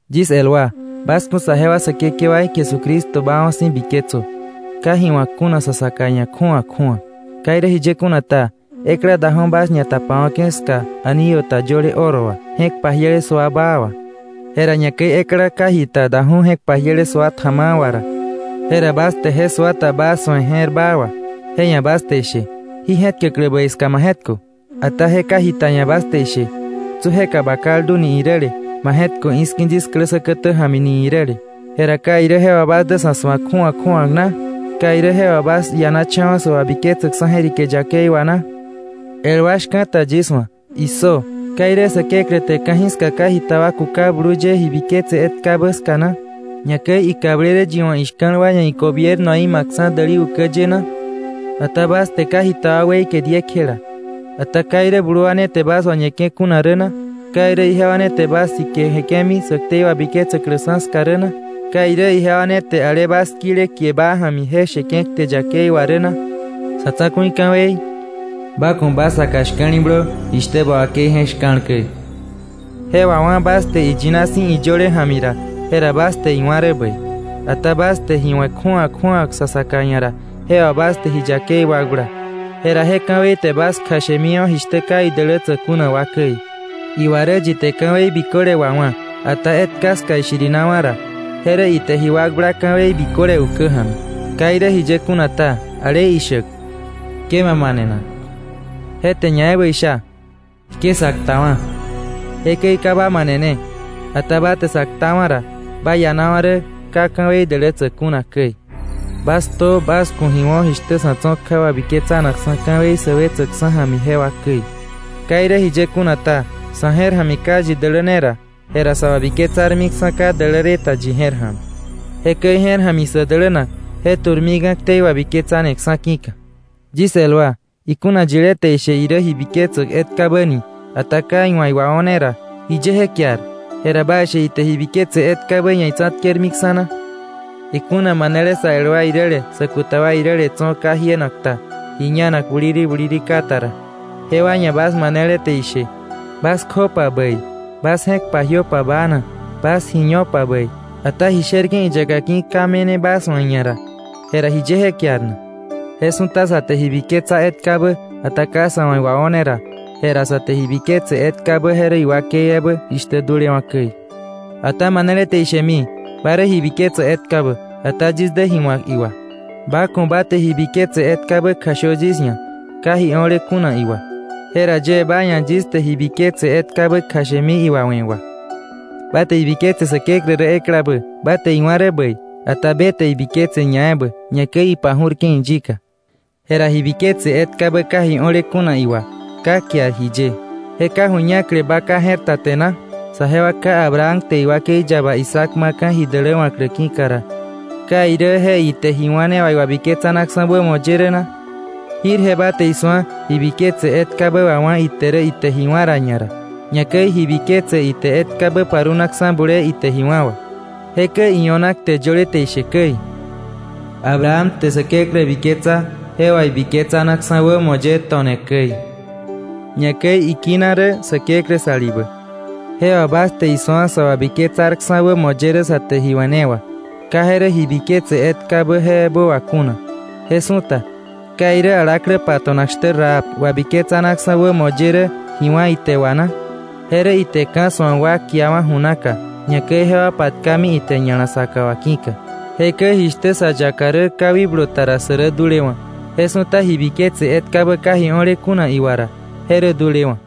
Yis el wa, bas ku̱ saje wa Säkekewaí Jesucristo baawa̱ si̱ biketsö, ka ji wa̱k kuna sa saka ia̱ kju̱awa kju̱awa. Ka irä jiye kuna ta, ekla daju̱ bas ñatapawa̱ke̱ ska anillo ta yöle oro wà, je̱k pajiele sua baa wà, jera ñakäi ekla ka jita daju̱ je̱k pajiele sua tja̱ma̱a̱ wà ra, jera bas te je sua ta baa su̱e je̱r baa wà, je ia̱ bas te ishe: “Jí je̱tkäklä bäi ska ma je̱tkö.” Ata je ka jita ia̱ bas te ishe: “tsu jeka ba kaldu” ni iräle, “ma je̱tkö i̱ski̱ yis klä säkätä ja̱mi” ni iräle. Jera ¿ka irä je wà bas dä sa̱ su̱ak kju̱awa kju̱awa na? ¿Ka irä je wà bas ianacha̱wa̱ sä wabiketsäk je̱rike yakei wà na? El wa shka̱ta yis wa̱, issö: ¿Ka irä Säkeklä te ka̱jiska ka jita wa kuka blu ye ji biketse etkabä ska na, ñakäi ikablele yi wa̱ ishka̱l wa ia̱ igobiernoí ma̱kksa̱ je kukäk däli ukä ye na? Ata bas te ka jita wa weike diekjela. ¿Ata ka irä blu wa ne te bas wañeke̱ kuna rä na? ¿Ka irä ijewa ne te bas sike jeke̱mi sä ktei wabiketsäklä ska rä na? ¿Ka irä ijewa ne te ale bas kile kie baa ja̱mi je sheke̱ kte yakei wà rä na? Sa̱ Tsa̱ku̱i ka̱wei: “Ba ku̱ ba saka shka̱li̱blö jishtä ba wakei je̱k shka̱l käi”, je wawá̱ bas te iyina si̱ iyöle ja̱mi ra, jera bas te iwá̱ rä bäi. Ata bas te ji we̱ kju̱awa kju̱awa sa saka ia̱ ra, jewa bas te ji yakei wakbla, jera je ka̱wei te bas kjashemiwa̱ jishtä ka idälätsäk kuna wa käi. Iwa rä, yi te ka̱wei biköle wawá̱, ata etka ska ishirinawa̱ ra, je rä ite ji wakbla ka̱wei biköle ukä ja̱mi. Ka irä jiye kuna ta, ale ishäk: “Ke ma manenak”, je te ñaebä isha: “Ke sa ktawa̱.” Jekäi ka ba manene, ata ba te sa ktawa̱ ra, ba ianawa̱ rä ka ka̱wei dälätsäk kuna käi. Jekäi bas ktö, jekäi bas ku̱ ji wo̱, jishtä sa̱ tso̱ kja wabiketsanakksa̱ ka̱wei sä wetsäkksa̱ ja̱mi jewa käi. Ka irä jiye kuna ta, sa̱ je̱r ja̱mi ka yi daläne ra, je wabiketsarmiksa̱ ka däläle ta. Jekäi je̱r ja̱mi sä dälänak, je tu̱rmika̱ ktei wabiketsaneksa̱ ki̱ka. Yis el wa, ikuna yilé te ishe irä ji biketsäk etkabä ni, ata ka iwa̱ iwao̱ne ra, ¿jiye je kiar? Jera ¿baishe ite ji biketsa etkabä ia̱ itsa̱tkermiksa̱ na? Ikuna manele sä el wa iräle sä kuta wa iräle tso̱ ka jienak ta, ji ñanak buliri buliri ka ta ra, jewa ia̱ bas manele te ishe: “Bas kjöpa bäi, bas je̱k pajiöpa baana, bas ji ñopa bäi”, ata ji sherke̱ iyaka ki̱ ka me̱ne bas wa̱ iia̱ ra, jera ¿jiye je kiar? Je su̱ta sa te ji biketsa etkabä, ata ka sa̱ wa̱ iwao̱ne ra, jera sa te ji biketse etkabä je rä iwakei ebä ra dulewa̱ käi. Ata manele te ishemi: “Ba rä ji biketsäk etkabä, ata yis dä ji wa̱k iwà.” Ba ku̱ ba te ji biketse etkabä kjashö yis ia̱ ka ji o̱le kuna iwà, jera yie ba ia̱ yis te ji biketse etkabä kjashemi iwawe̱ wà. Ba te ibiketse Säkeklä rä eklabä. Ba te iwá̱ rä bäi. Ata be te je biketse ñaebä, ñakäi ipaju̱rke̱ iyika. Jera ji biketse etkabä ka ji o̱le kuna iwà, ka kiar jiye, ¿je ka ju̱ñakle ba ka je̱r ta te na? Saje wa ká Abraham te iwakei yaba Isaac ma̱ka̱ ji däläwa̱klä ki̱ka ra, ¿ka irä je ite ji wá̱ ne wà iwabiketsanaksa̱ wämo ye rä na? Jirje ba te isu̱a, ji biketse etkabä wawá̱ ite rä ite ji wá̱ ra ñara, ñakäi ji biketse ite etkabä parunakksa̱ bulee ite ji wá̱ wà. Jekäi io̱na kte yöle te ishe käi: “Abraham te Säkeklä biketsa, je wà ibiketsanaksa̱ wämo ye to̱ne käi”, ñakäi ikina rä Säkeklä salibä. Je wà bas te isu̱a sä wabiketsarksa̱ wämo ye rä sa te ji we̱ ne wà, ka je rä ji biketse etkabä je ebä wà kuna. Je su̱ta, ¿ka irä ñakäi alaklä pato̱nak shtä Rahab wabiketsanaksa̱ wämo ye rä ji wá̱ ite wà na? Je rä ite ka̱ su̱ak wa kiawa̱ ju naka, ñakäi jewa patka ite ña̱la saka wà ki̱ka. Jekäi jishtä sa yaka rä ka wikblu ta ra, sä rä dulewa̱, je su̱ta ji biketse etkabä ka ji o̱le iwà ra, je rä dulewa̱.